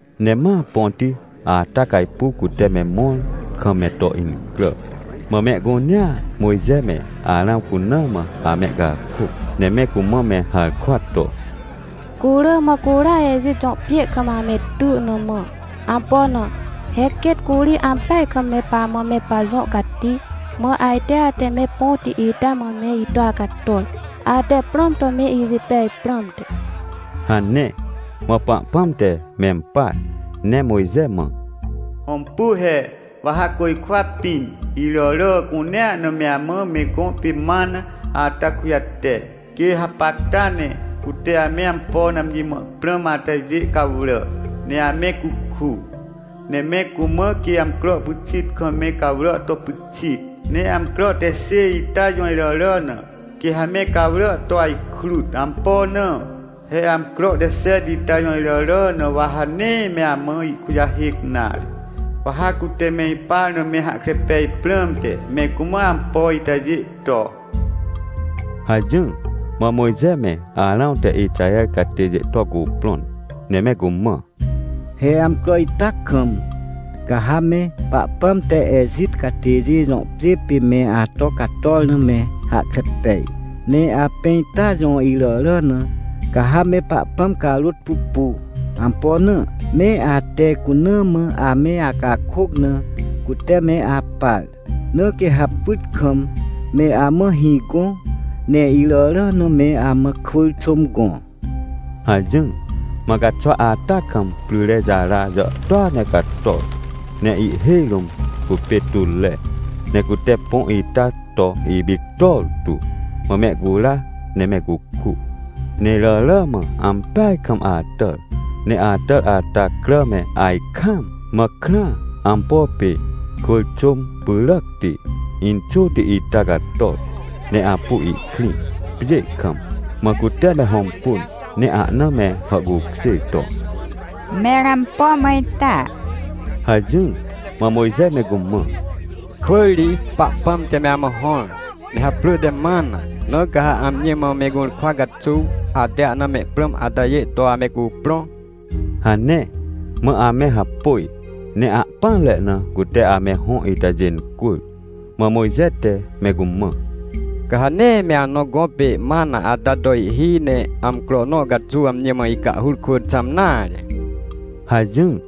Ne ma põti ata cajpuw cute me mõr kam me to incrà. Mã mehcunea Mojxe me Arãw cuna mã amehcakôc, ne me cumã me harkwa to: — Cu rỳ mã curia Ejit jõ pjê kam ame ty na mã. Ampo na? He quêt curi ampeaj kam me pamãme pajõ cati. Mã ajte ate me põti ita mã me ito acator, ate prãm to meijipej prãmte — hane. Mã Pahpãm te mempar ne Mojxe mã: — Hõmpu he, wa ha côjkwa pĩn, iràrà cunea na meamã me gõ pê mana ata kujate. Quê hapacta ne, cute ame ampo na amji mã me prãm atajê cawrà, ne ame cuku. Ne me cumã quê amcro pyxit kam me cawrà to pyxit, ne amcro te xêj ita jõiràrà na, quê ha me cawrà to ajkrut. Ampo na? He amcro te xet ita jõiràrà na wa ha nee me amã ihkujahêc nare. Wa ha cute me ipar name hahkre pej prãmte, me cumã ampoitajê to — hajỹr. Mã Mojxe me Arãw te Ixaher catêjê tocuprõn, ne me cumã: — He amcro ita kam, ca ha me Pahpãm te Ejit catêjê jõ pjê pê me ato cator name hahkre pej. Ne apẽ ita jõ iràrà na, ca ha me Pahpãm carôt pupu. Ampo na? Me ate cuna mã ame acakôc na cute me apar. Na quê ha pyt kam meamã hĩ gõ, ne iràrà na me amã kwỳr xôm gõ — hajỹr. Mã caxwa ata kam pryrejara jàhtôa ne cator, ne ihhêj rũm cupê tutre, ne cute põ ita to ipictor tu. Mã mehcura ne me cuku. Ne iràrà mã ampeaj kam atàr, ne atàr ata cràme ajkaam, mã krãa, ampo pê kwỳr xôm pyràcti, inxôti ita cator, ne apu ihkrĩ pjê kam. Mã cute me hõmpun, ne ahna me hàhcukjêr to: — Mẽr ampo mã ita? — hajỹr. Mã Mojxe me cumã: — Kwỳr ri Pahpãm te me amã hõr, ne haprỳ temana. Na ca ha amjimã, me gũrkwa caxuw, ate ahna me prãm atajê to ame cuprõ — hane. Mã ame hapôj, ne ahpỹanre na cute ame hõ itajê incwỳr. Mã Mojxe te me cumã: — Ca ha nee me anõ gõ pê mana ata to ihhi, ne amcro nõcaxuw amji mã ihcahhur kwỳ xãm nare — hajỹr.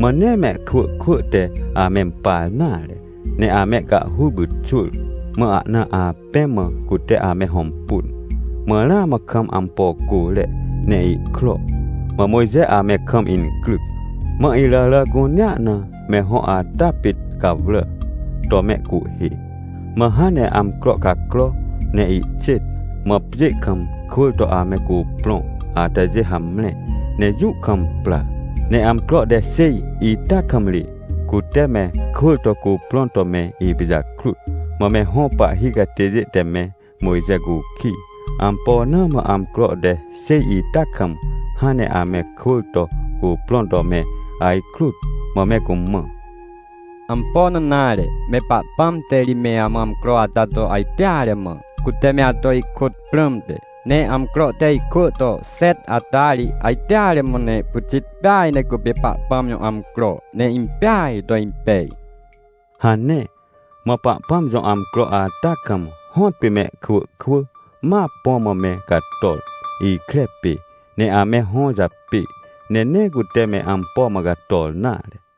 Mãnee mehkwỳ kwỳ te amempar nare, ne amehcahhur pyxwỳr. Mã ahna apẽ mã cute ame hõmpun, mãramã kam ampo côre, ne ihkro. Mã Mojxe ame kamincryc. Mã iràrà cunea na me hõ ata pit cawrà to mehcuhhê. Mã hãn ne amcro cacrone ihxêt, mã pjê kam kwỳr toame cuprõ atajê hamre ne jũ kam pra. Ne amcro te xêj ita kam ri, cute me kwỳr tocuprõn to me ipijakrut. Mã me hõ pahhi catêjê te me Mojxe cukij, ampona mã amcro te xêj ita kam hãn ne ame kwỳr to cuprõn to me ajkrut. Mã me cumã: — Ampo na nare, me Pahpãm te rime amã amcro ata to ajteare mã, cute me ato ihkôtprãmte. Ne amcro te ihkwỳ to xet ata ri, ajteare mã ne pyxit peaj necupê Pahpãm jõ amcro, neimpeaj to impej — hane. Mã Pahpãmjõ amcro ata kam hõtpê mehkwỳ kwỳma põ mã me cator, ikre pê, ne ame hõ japê, ne neecute me ampo mã cator nare.